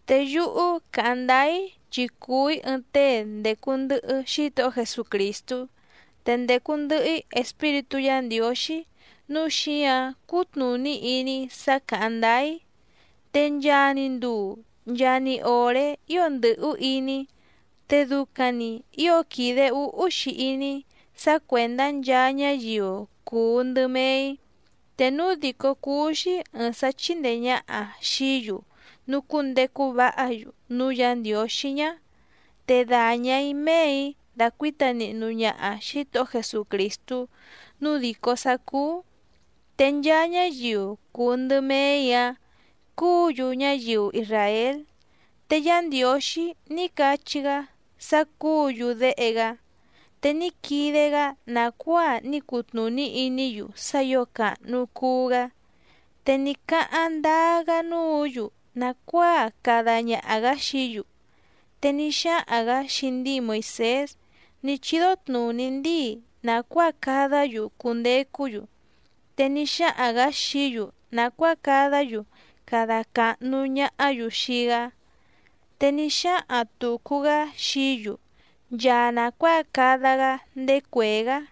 Te yúhú càháⁿ ndáá‑í chi cùu‑í ɨɨⁿ tée ndècu ndɨhɨ Xítohó Jesucrìstú, te ndècu ndɨhɨ‑í Espíritú Yǎ Ndiǒxí nǔu xíǎⁿ cútnùní iní‑í sá càháⁿ ndáá‑í. Te nchaa‑ni nduu nchaa‑ni òré ío ndɨ̀hú iní‑í, te ducaⁿ‑ni ǐo quìde úhú‑xi iní‑í sá cuèndá nchaa ñáyiu cùu ndɨ mee‑í. Te núu dìcó cúú‑xí ɨ̀ɨⁿ sá chíndèe ñaha xií‑yu nucúndecu váha‑yu núú Yǎ Ndiǒxí ñá, te dàña‑í méè‑í dàcuíta nihnu ñaha Xǐtohó Jesucrìstú nǔu dìcó sá cúú. Te nchaa ñáyiu cùu ndɨ mee‑í‑áⁿ cúǔ‑yu ñáyiu isràél, te Yá Ndiǒxí ní cachí‑gá sá cúǔ‑yu déhe‑gá, te ní quide‑gá nàcuáa ní cutnùní iní‑yu sá ǐo càhnu cuu‑gá, te ní cáháⁿ ndáá‑gá núǔ‑yu nàcuáa cada ñaha‑gǎ xií‑yu, te ní xáhaⁿ‑gǎ xii ndíi Moìsés ní chídó tnùní ndíi nàcuáa cadá‑yu cundecú‑yu. Te ní xáhaⁿ‑gǎ xií‑yu nàcuáa cadá‑yu cada càhnu ñahá‑yu xii‑gá, te ní xáhaⁿ tùcu‑gá xií‑yu nchaa nàcuáa cada‑gá ndéé cuèé‑gá.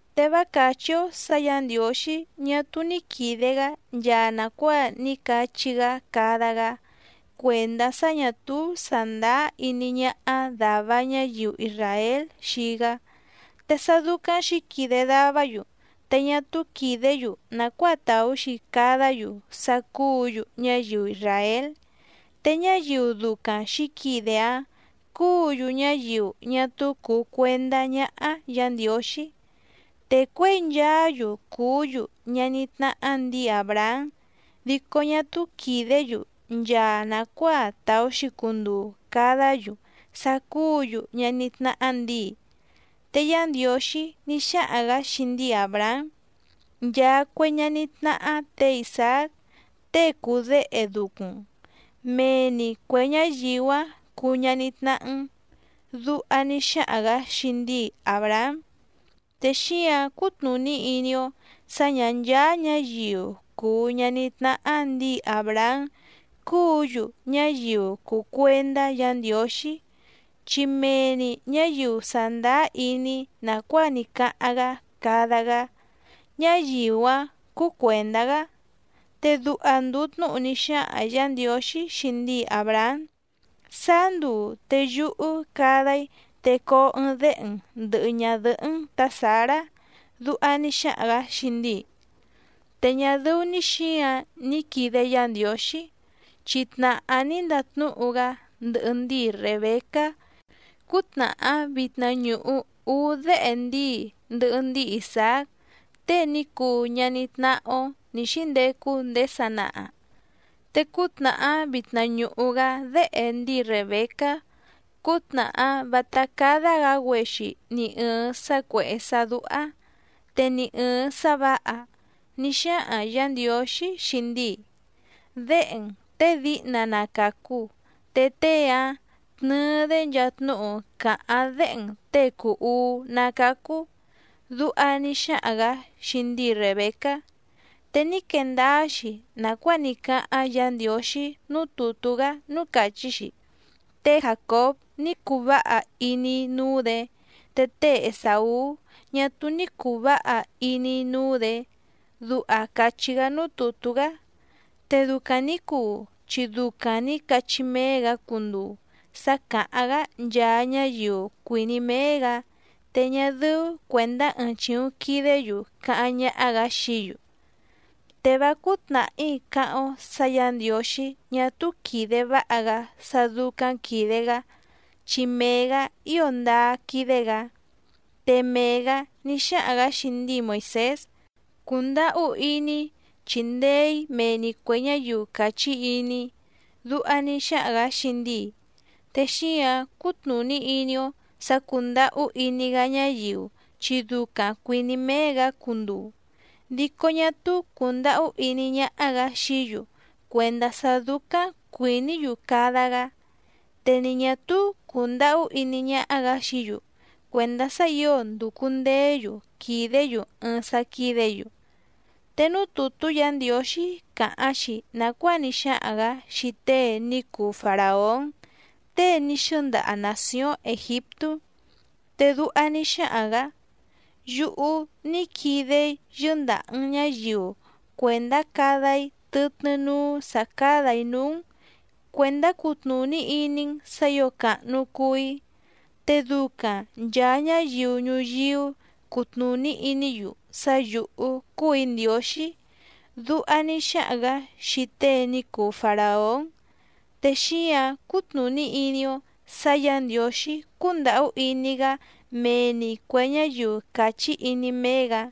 Te vá càchí‑ó sǎ Yǎ Ndiǒxí ñá túú ní quìde‑gá nchaa nàcuáa ní cachí‑gá cada‑gá cuèndá sá ñà túú sàndáá iní ñáhá dàva ñáyiu isràél xii‑gá. Te sá dúcáⁿ xǐquide davá‑yu te ñá túú quìdé‑yu nàcuáa tàú‑xi cadá‑yu sá cúǔ‑yu ñáyiu isràél. Te ñáyiu ducaⁿ xǐquide‑áⁿ cúǔ‑yu ñáyiu ñá túú cùu cuendá ñáhá Yǎ Ndiǒxí. Te cuěi nchaá‑yu cùú‑yu ñaní tnáhá ndǐi Àbrahám dico ñá túú quìdé‑yu nchaa nàcuáa tàú‑xi cunduu cadá‑yu sá cúǔ‑yu ñaní tnáhá ndǐi. Te Yá Ndiǒxí ní xáhaⁿ‑gǎ xii ndíi Àbrahám: “Nchaa cue ñaní tnáhá tě Isàác tée cùu déhe ducuⁿ‑n, mee‑ni cuè ñáyiu‑áⁿ cuu ñaní tnáhá‑n”, duha ní xáhaⁿ‑gǎ xii ndíi Àbrahám. Te xíǎⁿ cútnùní iní‑ó sǎ ñǎ ncháá ñǎyiu cùu ñaní tnáhá ndǐi Àbrahám cúǔ‑yu ñáyiu cùu cuendá Yǎ Ndiǒxí, chi mee‑ni ñǎyiu sàndáá iní nàcuáa ní cáháⁿ‑gá cada‑gá, ñáyiu‑áⁿ cúú cuèndá‑gá. Te duha ndùu tnúhu ní xáhaⁿ Yǎ Ndiǒxí xii ndíi Àbrahám: “Sáá nduu te yúhú cada‑í te coo ɨɨⁿ déhe‑n ndɨ̀hɨ ñadɨhɨ́‑n tǎ Sǎrá”, duha ní xáhaⁿ‑gǎ xii ndíi. Te ñá dɨ́ú‑ní xǐǎⁿ ní quìde Yá Ndiǒxí, chi tnàhá ní ndatnúhu‑gá ndɨhɨ ndíi Rèbecá cútnàhá vitna ñùhu úú déhe ndíi ndɨhɨ ndíi Isàác tée ní cuu ñaní tnáhá‑ó nǐ xíndecu ndéé sanaha. Te cútnàhá vitna ñùhu‑gá déhe ndíi Rèbecá, cútnàhá vátá cádá‑gǎ‑güexi ni ɨ̀ɨⁿ sá cuèhé sá dúhá, te ni ɨ̀ɨⁿ sá vǎha, ní xáhaⁿ Yǎ Ndiǒxí xii ndíi: “Déhe‑n těe díhna na càcu te tée‑áⁿ tnɨɨ‑dé nchaa tnúhu cáháⁿ déhe‑n těe cùu uú ná càcu”, duha ní xáhaⁿ‑gǎ xii ndíi Rèbecá. Te ní quee ndáá‑xi nàcuáa ní cáháⁿ Yǎ Ndiǒxí núú tùtú‑gá núú càchí‑xi: “Té Jàcób ní cuu váha iní‑í núú‑dě, te té Esàú ñá túú ní cùu váha iní‑í núú‑dě”, duha càchí‑gá núú tùtú‑gá. Te ducaⁿ nǐ cuu chi ducaⁿ nǐ cachí méé‑gǎ cunduu sá càháⁿ‑gá nchaa ñáyiu cuìní méé‑gǎ, te ñá dɨ́ú cuèndá ɨɨⁿ chìuⁿ quidé‑yu càháⁿ ñáhá‑gǎ xií‑yu. ¡Te vá cúú tnàhí cáháⁿ‑ó sǎ Yǎ Ndiǒxí ñá túú quìde váha‑gá sá dúcáⁿ quìde‑gá chi mee‑gǎ ío ndáá quídé‑gǎ! Te mee‑gǎ ní xáhaⁿ‑gǎ xii ndíi Moìsés: “Cundàhú iní‑í chindee‑ǐ mee‑ni cuè ñáyiu càchí iní‑í”, duha ní xáhaⁿ‑gǎ xii ndíi. Te xíǎⁿ cútnùní iní‑ó sǎ cúndàhú iní‑gá ñáyiu chi ducaⁿ cuìní méé‑gǎ cunduu, dico ñá túú cùndahú iní ñáhá‑gǎ xií‑yu cuèndá sá dúcáⁿ cuìní‑yu cada‑gá, te ni ñà túú cùndahú iní ñáhá‑gǎ xií‑yu cuèndá sá ǐo ndùcu ndeé‑yu quìdé‑yu ɨɨⁿ sá quídě‑yu. Te núú tùtú Yǎ Ndiǒxí càháⁿ‑xi nàcuáa ní xáhaⁿ‑gǎ xii tée ní cuu Faràón tée ní xɨ́ndaha nàcióⁿ Ègiptú, te duha ní xáhaⁿ‑gǎ: “Yúhú ní quide‑í yɨ́ndàha‑n ñáyiu cuèndá cada‑í tɨtnɨ́ núú sǎ cádà‑í núú‑n cuèndá cutnùní iní‑n sǎ ǐo càhnu cuu‑í, te ducaⁿ nchàa ñáyiu ñuyíú cutnùní iní‑yu sá yǔhú cúù‑í Ndiǒxí”, duha ní xáhaⁿ‑gǎ xii tée ní cuu Faràón. Te xíǎⁿ cútnùní iní‑ó sǎ Yǎ Ndiǒxí cúndàhú iní‑gá mee‑ni cuè ñáyiu càchí iní méé‑gǎ,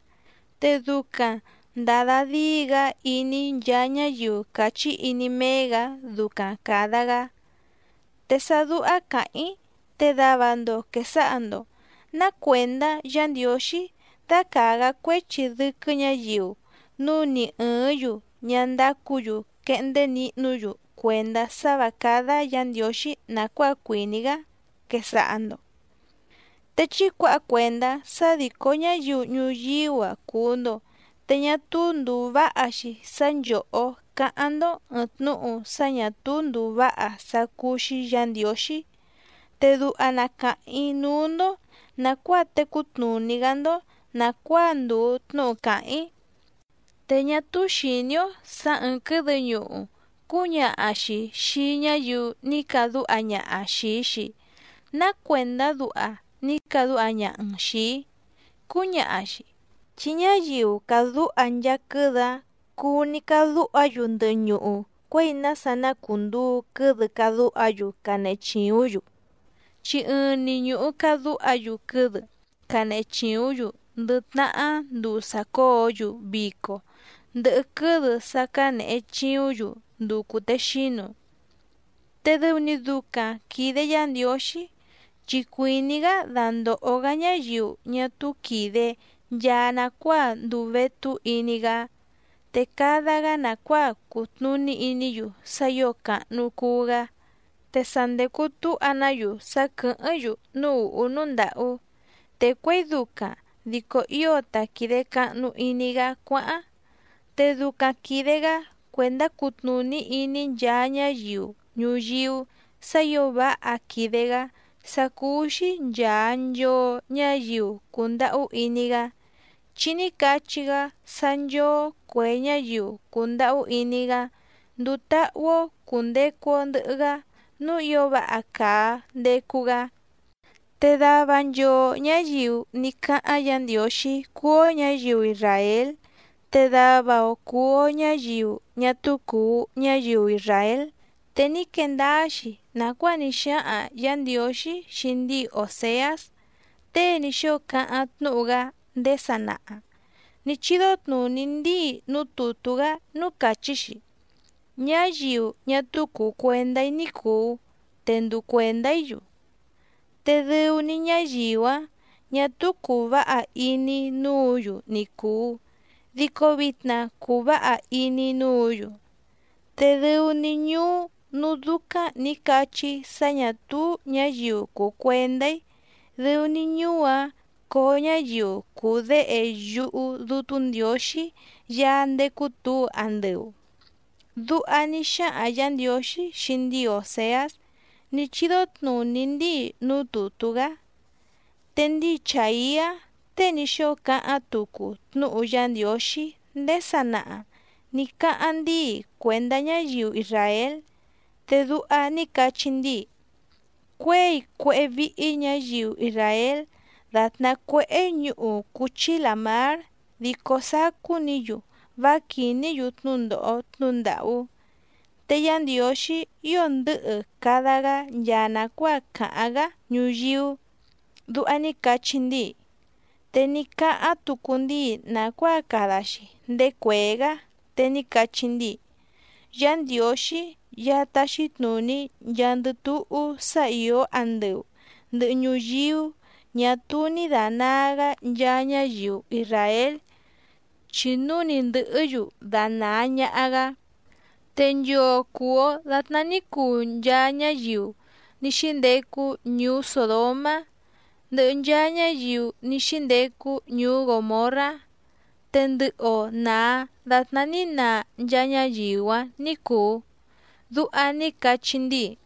te ducaⁿ ndàda díi‑gá iní nchaa ñáyiu càchí iní méé‑gǎ ducaⁿ càda‑gá. Te sá dúhá càháⁿ‑í te dava‑ndo quèsaha‑ndo: “Ná cuèndá Yǎ Ndiǒxí dácàa‑gá cuéchi dɨ́quɨ́ ñǎyiu núu ni ɨ̀ɨ́ⁿ‑yu ñá ndácǔ‑yu quehndé nihnú‑yu cuèndá sá vǎ cádá Yǎ Ndiǒxí nàcuáa cuìní‑gá”, quesaha‑ndo. Te chí cuǎha cuèndá sá dìcó ñáyiu ñuyíú‑a cùu‑ndo te ñá túú ndùu váha‑xi sá nchòhó cáháⁿ‑ndó ɨ̀ɨⁿ tnúhu sá ñà túú ndùu váha sá cúú‑xí Yǎ Ndiǒxí. Te duha na càháⁿ‑í núú‑ndó nàcuáa tecú tnùní‑gá‑ndó nàcuáa ndùu tnúhu càháⁿ‑í. Te ñá túú xìní‑ó sǎ ɨ̀ɨⁿ quɨ́dɨ ñuhu cúñaha‑xi xìi ñáyiu ní cadúha ñaha xìi‑xi: “Ná cuèndá duha ní cadúha ñaha‑n xìi‑í”, cúñaha‑xi. Chi ñáyiu càdúha nchaa quɨ́dɨ‑áⁿ cuu‑ni cadúha‑yu ndɨhɨ ñuhu cuěi nása na cùnduu quɨ́dɨ cadúha‑yu canehe chìúⁿ‑yu, chi ɨɨⁿ‑ni ñùhu cadúha‑yu quɨ́dɨ cánehe chìúⁿ‑yu ndɨ tnahá nduu sàcóo‑yu vico ndɨhɨ quɨ́dɨ sá cǎnehe chìúⁿ‑yu nduu cùtexínu. Te dɨu‑ni ducaⁿ quìde Yá Ndiǒxí, chi cuìní‑gá dandòho‑gá ñáyiu ñá túú quìde nchaa nacuáa nduu vétú iní‑gá, te cada‑gá nàcuáa cutnùní iní‑yu sá ǐo càhnu cuu‑gá. Te sa ndècu túha‑ná‑yu sá quɨ̀hɨ́ⁿ‑yu núú ùhú núú ndàhú, te cuěi ducaⁿ dico ío ta quìde cahnu iní‑gá cuáháⁿ. Te ducaⁿ quìde‑gá cuèndá cutnùní iní nchaa ñáyiu ñuyíú sǎ ǐo váha quìde‑gá sá cúú‑xí nchàa nchoo ñáyiu cùndahú iní‑gá, chi ní cachí‑gá sá nchóó cuè ñáyiu cùndahú iní‑gá nduu táhú‑ó cùndecu‑o ndɨhɨ‑gá núú ǐo váha càa ndecu‑gá. Te dava nchoo ñǎyiu ní cáháⁿ Yǎ Ndiǒxí cúú‑ó ñǎyiu isràél, te dava‑o cùu‑o ñáyiu ñá túú cùu ñáyiu isràél. Te ní quee ndáá‑xi nàcuáa ní xáhaⁿ Yǎ Ndiǒxí xii ndíi Òseás tée ní xóo cáháⁿ tnúhu‑gá ndéé sanaha nǐ chídó tnùní ndíi núú tùtú‑gá núú càchí‑xi: Ñáyiu ñá túú cùu cuendá‑í ní cùu te nduu cuèndá‑í‑yu, te dɨu‑ni ñáyiu‑áⁿ ñà túú cùu váha iní‑í núǔ‑yu ni cùu, dico vitna cùu váha iní‑í núǔ‑yu. Te dɨu‑ni ñuú núú dúcáⁿ nǐ cachí‑í sá ñà túú ñǎyiu cùu cuendá‑í dɨu‑ni ñuú‑áⁿ coo ñáyiu cuu déhe yúhú Dútú Ndiǒxí Yaá ndécú tǔu andɨu. Duha ní xáhaⁿ Yǎ Ndiǒxí xii ndíi Òseás ní chídó tnùní ndíi núú tùtú‑gá. Te ndíi Chàiá tée ní xóo cáháⁿ tucu tnúhu Yá Ndiǒxí ndéé sanaha nǐ cáháⁿ ndíi cuèndá ñáyiu isràél, te duha ní cachí ndíi: “Cuěi cuéhé víhí ñǎyiu isràél dàtná cuéhé ñuhu cúchí làmár dico sacú‑ni‑yu vá quìní‑yu tnúndòho tnúhu ndàhú. Te Yá Ndiǒxí ío ndɨ̌hɨ cada‑gá nchaa nàcuáa càháⁿ‑gá ñuyíú”, duha ní cachí ndíi. Te ní cáháⁿ tucu ndíi nàcuáa cada‑xi ndéé cuèé‑gá, te ní cachí ndíi: Yá Ndiǒxí Yaá táxí tnùní nchaandɨ túhú sá ìó andɨu ndɨ̀hɨ ñuyíú ñà túú ní dànaa‑gá nchaa ñáyiu isràél, chi núu ni ndɨ̀hɨ́‑yu danàa ñaha‑gá, te nchoo cùu‑o datná ní cuu nchaa ñáyiu ní xíndecu ñuú Sòdomá ndɨhɨ nchaa ñáyiu ní xíndecu ñuú Gòmorrá, te ndɨhɨ‑o nàa datná ní naa nchaa ñáyiu‑áⁿ ní cùu. Duha ní cachí ndíi.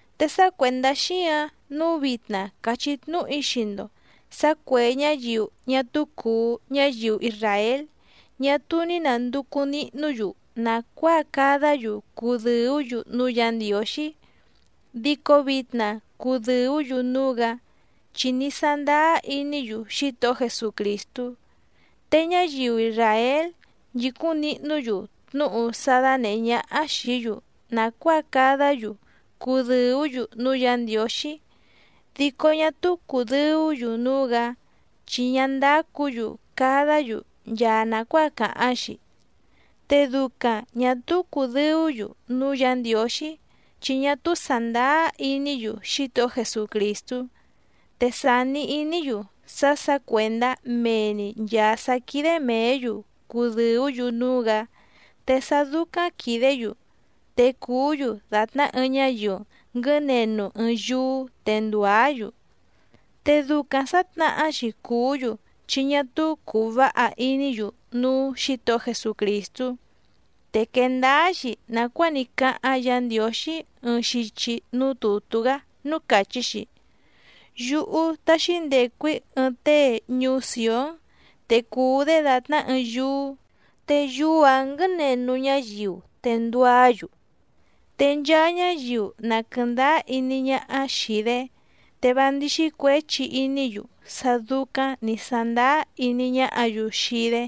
Te sá cuèndá xíǎⁿ nǔu vitna càchí tnúhu‑í xii‑ndo sǎ cuè ñáyiu ñá túú cùu ñáyiu isràél ñá túú ní nànducu nihnú‑yu nàcuáa cadá‑yu cudɨ̀ú‑yu núú Yǎ Ndiǒxí, dico vitna cùdɨú‑yu núú‑gǎ chi ní sándáá iní‑yu Xítohó Jesucrìstú. Te ñáyiu isràél nchìcúⁿ nihnú‑yu tnúhu sá dánèhé ñáhá xìí‑yu nàcuáa cadá‑yu cudɨ̀ú‑yu núú Yǎ Ndiǒxí dico ñá túú cùdɨú‑yu núú‑gǎ chi ñá ndácǔ‑yu cadá‑yu nchaa nàcuáa càháⁿ‑xi. Te ducaⁿ ñà túú cùdɨú‑yu núú Yǎ Ndiǒxí chi ñá túú sàndáá iní‑yu Xítohó Jesucrìstú, te sàni iní‑yu sá sǎ cuèndá mee‑ni nchàa sá quídé mèé‑yu cudɨ̀ú‑yu núú‑gǎ, te sá dúcáⁿ quìdé‑yu te cùú‑yu dàtná ɨɨⁿ ñáyiu nguɨ̌nenu ɨɨⁿ yúú te ndùá‑yu. Te ducaⁿ sǎtnahá‑xi cùú‑yu chi ñá túú cùu váha iní‑yu núú Xǐtohó Jesucrìstú. Te quèe ndáá‑xi nàcuáa ní cáháⁿ Yǎ Ndiǒxí ɨɨⁿ xichi núú tùtú‑gá núú càchí‑xi: Yúhú táxí ndècu‑í ɨɨⁿ tée ñuú Sìón, te cuu‑dé dàtná ɨɨⁿ yúú, te yúú‑ǎⁿ nguɨ̌nenu ñáyiu te nduá‑yu, te nchaa ñáyiu na quɨ̀ndáá iní ñáhá xìi‑dé, te vá ndíxí cuěchi iní‑yu sá dúcáⁿ nǐ sándáá iní ñáhǎ‑yu xii‑dé.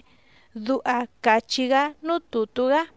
Duha càchí‑gá núú tùtú‑gá.